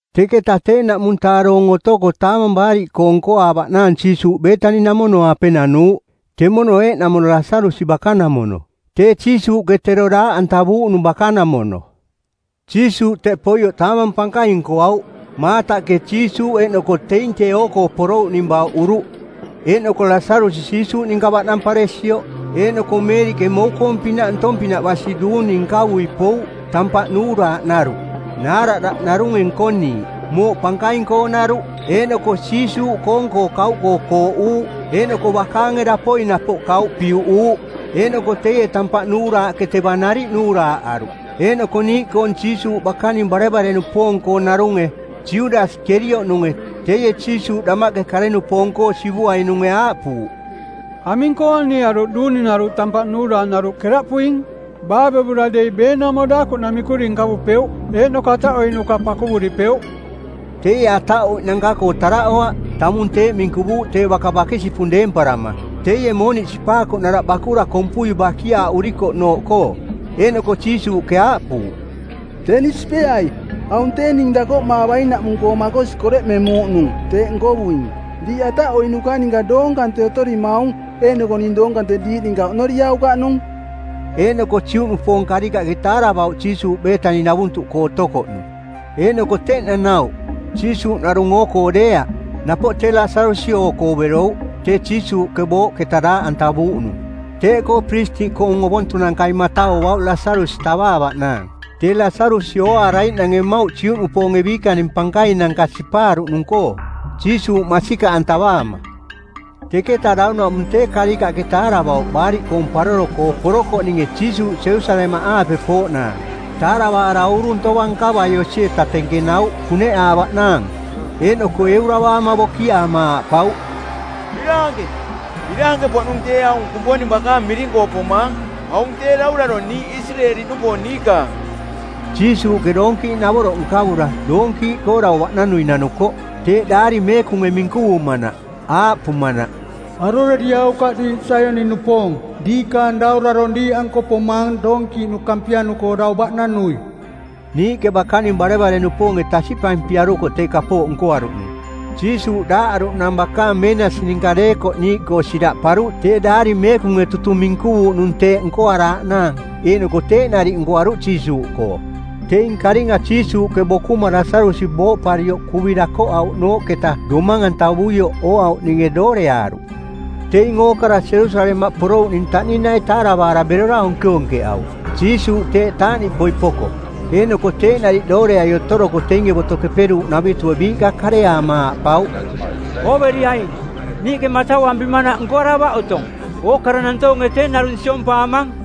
Teketa tee, ˜naꞌmung-taa doong otoko Taamang Baariꞌkoong˜ nkoaavaꞌnaang Jiisuuꞌ Beetani-namono-aape nanuuꞌ. Temono eeꞌnamono Lasarusi bakanamono, tee Jiisuuꞌke tero daaꞌantavuuꞌnung bakanamono. Jiisuuꞌ teꞌ poioꞌ taamang pankaing nkoauꞌ. Maataꞌke Jiisuuꞌ eeꞌnoko teing tee oo-koo porouꞌning bauꞌuruꞌ, eeꞌnoko Lasarusi Jiisuuꞌ ninka baꞌnamparesioꞌ. Eeꞌnoko Meeriꞌke mou-koong-pinaꞌ ntong-pinaꞌ basi duuni nkavui pouꞌ, tampaꞌ nuuraaꞌ naruꞌ, naaradaꞌ narunge nkoniiꞌ, mooꞌ pankaing-koonaruꞌ. Eeꞌnoko Jiisuuꞌkoong-koo kauꞌkoo kooꞌuuꞌ eeꞌnoko bakaange dapoi napoꞌ kauꞌ piuꞌuuꞌ. Eeꞌnoko teie tampaꞌ nuuraaꞌke teva nariꞌ nuuraaꞌaruꞌ. Eeꞌnoko niiꞌkoong Jiisuuꞌ bakaning barevare-nupoong-koonarunge, Judasi Kerioꞌnunge, teie Jiisuuꞌ damaꞌke kare-nupoong-koo sivuainunge aaꞌpuuꞌ, “Aming-koo anie aruꞌ duuninaruꞌ tampaꞌ nuuraaꞌnaruꞌ keraꞌpuing? Baavevura dei beenaumo daakuꞌ namikuri nkavupeuꞌ eeꞌnoko ataꞌoiꞌnuka pakuvuripeuꞌ.” Teie ataꞌoiꞌnanka-koo taraꞌoaꞌ, tamung teeꞌ minkuvuuꞌ tee baka bakisipung deemparama, teie mooniꞌ sipaakoꞌnaraꞌ bakura kompui bakiaaꞌurikoꞌnooꞌkoo. Eeꞌnoko Jiisuuꞌke aaꞌpuuꞌ, “Teni sipeai. Aung tee ning dakoꞌmaavainaꞌmung-koo makosi koreꞌmemuuꞌnung, teeꞌ nkovuing. Diiꞌ ataꞌoiꞌnuka ninka doong kante otorimaung eeꞌnoko ning doong kante diiꞌ ninka oꞌnoriaukaꞌnung.” Eeꞌnoko Juꞌnupoong karikaꞌke taaravauꞌ Jiisuuꞌ Beetani-navuntuꞌkoo otokoꞌnung. Eeꞌnoko teꞌ nanauꞌ, Jiisuuꞌ narung oo-koo deeaꞌ, napoꞌ tee Lasarusi oo-koo berouꞌ, tee Jiisuuꞌke booꞌketa daaꞌantavuuꞌnung. Teeꞌkoo piristiꞌkoong ovontunankai matauauꞌ Lasarusi tavaavaꞌnaang, tee Lasarusi ooaaraiꞌnange mmauꞌ Juꞌnupoonge biikaning pankainanka sipaaruꞌnung-koo, Jiisuuꞌ masikaꞌantavaama. Teketa daunaꞌmung tee karikaꞌke taaravauꞌ Baariꞌkoong Paroro-koo porokoꞌninge Jiisuuꞌ Jerusalemaꞌaape pooꞌnaang. Taaravaara uurung tovang nkavai osi-eta tenkenauꞌ kuneꞌaavaꞌnaang. Eeꞌnoko euravaama bokiaama aaꞌpauꞌ, “Biraanke! Biraanke-poꞌnung tee aung Kumponing bakaang miring-koo pomaang; aung tee daurarong niiꞌ Isireeli-nupoong niikaang!” Jiisuuꞌke doonkiiꞌnavoroꞌ nkavura, doonkiiꞌkoo dau baꞌnanui nanuko, teeꞌ Daari Meekunge minkuvumanaꞌ, aaꞌpumanaꞌ, “Aroreriaukaꞌ diiꞌ Saioni-nupoong, diikaang daurarong diiꞌanko pomaang doonkiiꞌnu kampianu-koo dau baꞌnanui.” Niiꞌke bakaning barevare-nupoonge tasiꞌpampiarukoꞌ tee kapooꞌ nkoaruꞌnung. Jiisuuꞌ daaꞌaruꞌnang bakaang meenasi ninka deekoꞌ niiꞌkoo siraꞌparuꞌ tee Daari Meekunge tutung minkuvuuꞌnung teeꞌ nkoaraaꞌnaang eeꞌnoko teeꞌ nariꞌ nkoaruꞌ Jiisuuꞌkoo. Teing karinga Jiisuuꞌke bokuma Lasarusi booꞌparioꞌ kuvi dakoꞌauꞌnooꞌketa domang-antavuioꞌ ooauꞌninge dooreaaruꞌ. Teing ookara Jerusalemaꞌ porouꞌning taꞌninai taaravaara berora onkeonkeꞌauꞌ, Jiisuuꞌ teeꞌ taaꞌniꞌpoi poko. Eeꞌnoko teeꞌ nariꞌ dooreai otoroko teinge Boto Keperuuꞌnavitue biiꞌka kareaama aaꞌpauꞌ, “Ooveriaing, niiꞌke matauampimanaꞌ nkoaravaꞌ otong. Ookara nantoonge tee narung siompaamang.”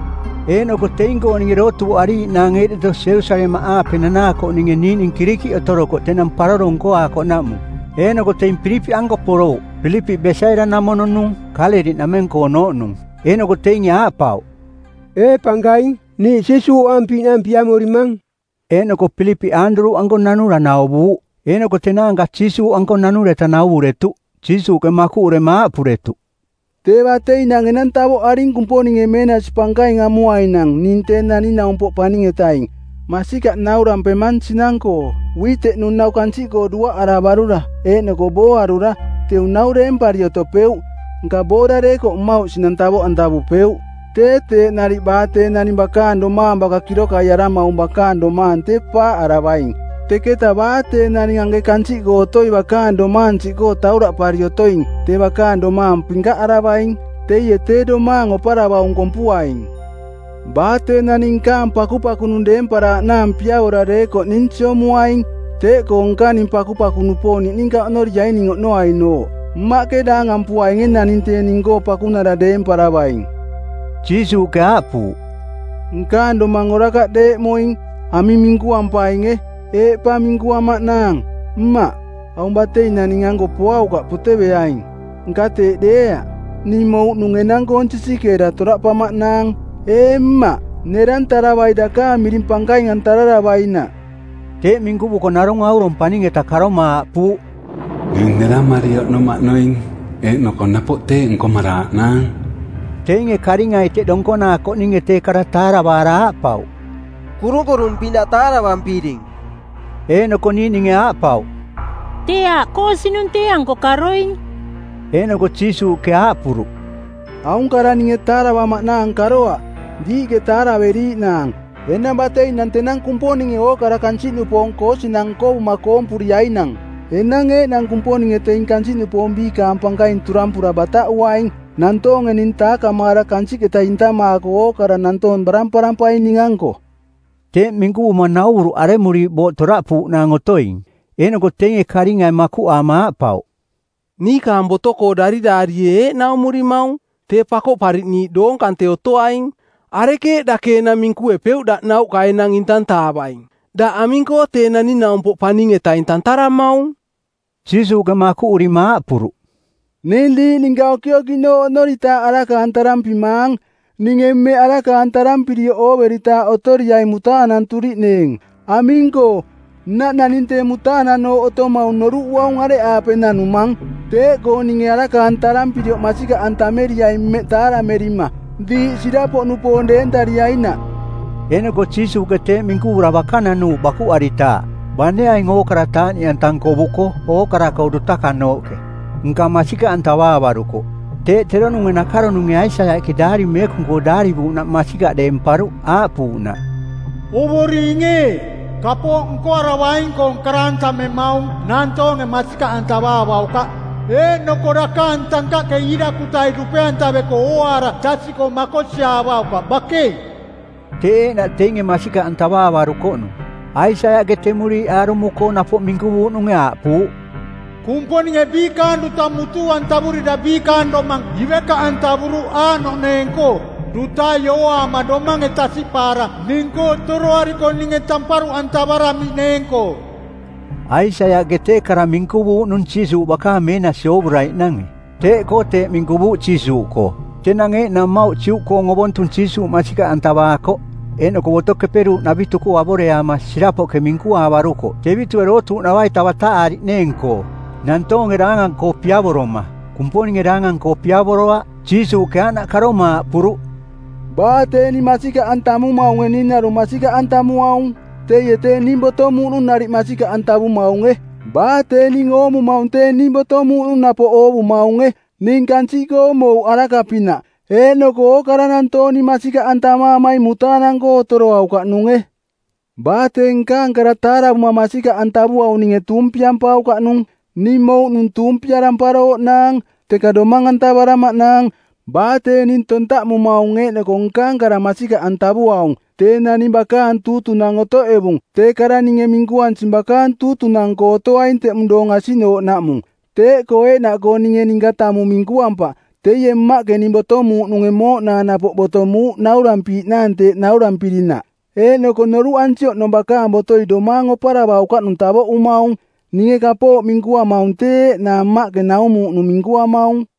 Eeꞌnoko teing-kooninge dootuuꞌariiꞌnaang eeꞌdeto Jerusalemaꞌaape nanaakoꞌninge niiꞌning Kirikiꞌ otorokoꞌ tenang paroro nkoaakoꞌnaꞌmung. Eeꞌnoko teing Pilipiꞌanko porouꞌ. Pilipiꞌ Besaida-namono-nung, Kaaleliꞌnameng-koonooꞌnung. Eeꞌnoko teinge aaꞌpauꞌ, “Ee pankaing, niiꞌ Jiisuuꞌ ooampiiꞌnaang piamorimang.” Eeꞌnoko Pilipiꞌ Aanduruꞌanko nanura nauvuuꞌ, eeꞌnoko tenaanka Jiisuuꞌanko nanureta nauvuretuꞌ. Jiisuuꞌke makuꞌurema aaꞌpuretuꞌ, “Tee bateinang enang tavoꞌaring Kumponinge meenasi pankaing amuainang ning tee Naning-naumpoꞌ Paning-etaing. Masikaꞌ naurampemang sinang-koo, uiteꞌnu˜ nau kansiꞌkoo duaꞌaravarura eeꞌnoko booarura, teu nau deempari otopeuꞌ, nka boora deekoꞌ mmauꞌ sinang tavoꞌantavupeuꞌ. Tee teeꞌ nariꞌ baa tee naning bakaang domaang baka kirokaiaramaung bakaang domaang tee paaꞌaravaing, teketa baa tee naning anke kansiꞌkoo otoi bakaang domaang siꞌkoo tauraꞌpari otoing tee bakaang domaang pinkaꞌaravaing. Teie tee domaang oparavaung kompuaing. Baa tee naning nkaang pakupakunung deemparaaꞌnaang piavora deekoꞌ ning siomuaing. Teeꞌkoo nkaning pakupaku-nupoong niꞌninka oꞌnoriaing ning oꞌnoainooꞌ. Mmaꞌke daangampuainge naning tee ning-koo pakunara deemparavaing.” Jiisuuꞌke aaꞌpuuꞌ, “Nkaang domang orakaꞌ deeꞌmoing. Aming minkuampainge? Eeꞌ pa minkuamaꞌnaang, ‘Mmaꞌ, aung bateinang ning-anko poaukaꞌ poteveaing?’ Nka teeꞌ deeaꞌ. Ning mouꞌnung enang-koong sisikeera toraꞌpamaꞌnaang. Ee Mmaꞌ, nerantaravai dakaang miring pankaing-antararavainaꞌ.” Teeꞌ minkuvuko narung aurong paning-eta karoma aaꞌpuuꞌ, “Ning neramari oꞌnomaꞌnoing, eeꞌnoko napoꞌ teeꞌ nkomaraaꞌnaang.” Teinge karingai teꞌ donkonaakoꞌninge tee kara taaravaara aaꞌpauꞌ, “Kurunkurung-pinaꞌ taaravampiring.” Eeꞌnoko niiꞌninge aaꞌpauꞌ, “Tee aaꞌ koosinung˜ tee-anko karoing.” Eeꞌnoko Jiisuuꞌke aaꞌpuruꞌ, “Aung kara ninge taaravamaꞌnaang karoaꞌ, diiꞌke taaraveriiꞌnaang. Enang bateinang tenang Kumponinge ookara kansiꞌnupoong koosinang nkovuma koompuriainang. Enang eeꞌnang Kumponinge teing kansiꞌnupoong biikaang pankaing turampura bataꞌuaing. Nantoonge ning taakamaara kansiꞌketa intamaako ookara nantoong baramparampaing ning-anko.” Teeꞌ minkuvuma nauvuruꞌ aremuriiꞌ booꞌ toraꞌpuuꞌnaang otoing. Eeꞌnoko teinge karingai makuꞌaama aaꞌpauꞌ, “Niikaang boto-koo dariraarie eeꞌ naumurimaung: tee Pakoꞌpariꞌniiꞌ doong kante otoaing. Arekeeꞌ dake enang minkuepeuꞌ daꞌ nauꞌka enang intantaavaing? Daꞌ aming-koo ‘Tee Naning-naumpoꞌ Paning-etaing’ tantaramaung”? Jiisuuꞌke makuꞌurima aaꞌpuruꞌ, “Ning diiꞌ ninka okiokiꞌnooꞌ oꞌnoritaaꞌ araka-antarampimaang. Ninge mmeꞌ araka-antarampirioꞌ ooveritaaꞌ otoriaing mutaananturiꞌneeng. Aming-koo, nnaꞌ naning tee mutaananooꞌ otomaung noruꞌuaung areꞌaape nanumang. Teeꞌkoo ninge araka-antarampirioꞌ masikaꞌantameriaing mmeꞌ taaramerima, diiꞌ sirapoꞌnupoong deentariainaꞌ.” Eeꞌnoko Jiisuuꞌke teeꞌ minkuvura baka nanuuꞌ bakuꞌaritaaꞌ. Bane aing ookara taaꞌniꞌanta nkovuko ookara-koo dutakanooꞌke, nka masikaꞌantavaavarukoꞌ. Teeꞌ teronunge nakaronunge Aisaiaꞌke Daari Meekung-koo daarivuuꞌnaꞌ masikaꞌ deemparuꞌ, aaꞌpuuꞌnaꞌ, “Ovoring ee, kapooꞌ nkoaravaing-koong karantamemaung˜ nantoonge masikaꞌantavaavaukaꞌ, eeꞌnoko dakaang tankaꞌke iirakutai dupe-antaveko ooaara tasiꞌkoo makosiaavaukaꞌ bakei!” Teeꞌ eeꞌnaꞌ teinge masikaꞌantavaavarukoꞌnung. Aisaiaꞌke temuriiꞌ aarumo-koo napoꞌ minkuvuuꞌnunge, aaꞌpuuꞌ, “Kumponinge biikaang duta mutuu-antavurira biikaang domang ivekaꞌantavuruꞌ aaꞌnoꞌneeng-koo: dutai ooaama domange tasiꞌpaara ning-koo toroariko ninge tamparuꞌantavaramiꞌneeng-koo.” Aisaiaꞌke tee kara minkuvuuꞌnung Jiisuuꞌ bakaang meenasi oovuraiꞌnange. Teeꞌkoo teeꞌ minkuvuuꞌ Jiisuuꞌkoo. Tenang eeꞌnang mmauꞌ Juꞌkoong Ovontung Jiisuuꞌ masikaꞌantavaakoꞌ, eeꞌnoko Boto Keperuuꞌnavitu-koo avoreaama sirapoꞌke minkuaavarukoꞌ tevitue dootuuꞌnava-ita bataꞌaariꞌneeng-koo. Nantoonge daangang-koo piavoroma, Kumponinge daangang-koo piavoroaꞌ. Jiisuuꞌke aaꞌnaꞌ karoma aaꞌpuruꞌ, “Baa tee ning masikaꞌantamumaunge ning narung masikaꞌantamuaung, teie tee ning botomuuꞌnung nariꞌ masikaꞌantavumaunge. Baa tee ning oomumaung tee ning botomuuꞌnung napoꞌ oovumaunge. Ning kansiꞌkoo mouꞌ araka-pinaꞌ. Eeꞌnoko ookara nantoong ning masikaꞌantamaamaing mutaanang-koo otoroaukaꞌnunge. Baa tee nkaang kara taaravuma masikaꞌantavuaung ninge tuumpiampaukaꞌnung. Ning mouꞌnung tuumpiaramparooꞌnaang, teka domang-antavaramaꞌnaang. Baa tee ning tontaꞌmumaung eeꞌnoko nkaang kara masikaꞌantavuaung, tee naning bakaang tuutunang˜ otoꞌevung-tee kara ninge minkuansing bakaang tuutunang-nko otoaing teꞌmung doong asiꞌnooꞌnaꞌmung. Teeꞌkoo eeꞌnaꞌkoo ninge ninka tamung minkuampaꞌ, teie Mmaꞌke ning botomuuꞌnunge mooꞌnaang napoꞌ botomuuꞌ naurampiiꞌnaang teeꞌ naurampirinaꞌ. Eeꞌnoko noruꞌansi oꞌnong bakaang botoi domaang oparavaukaꞌnung tavoꞌumaung. Ninge kapooꞌ minkuamaung tee eeꞌnaa Mmaꞌke naumuuꞌnung minkuamaung.”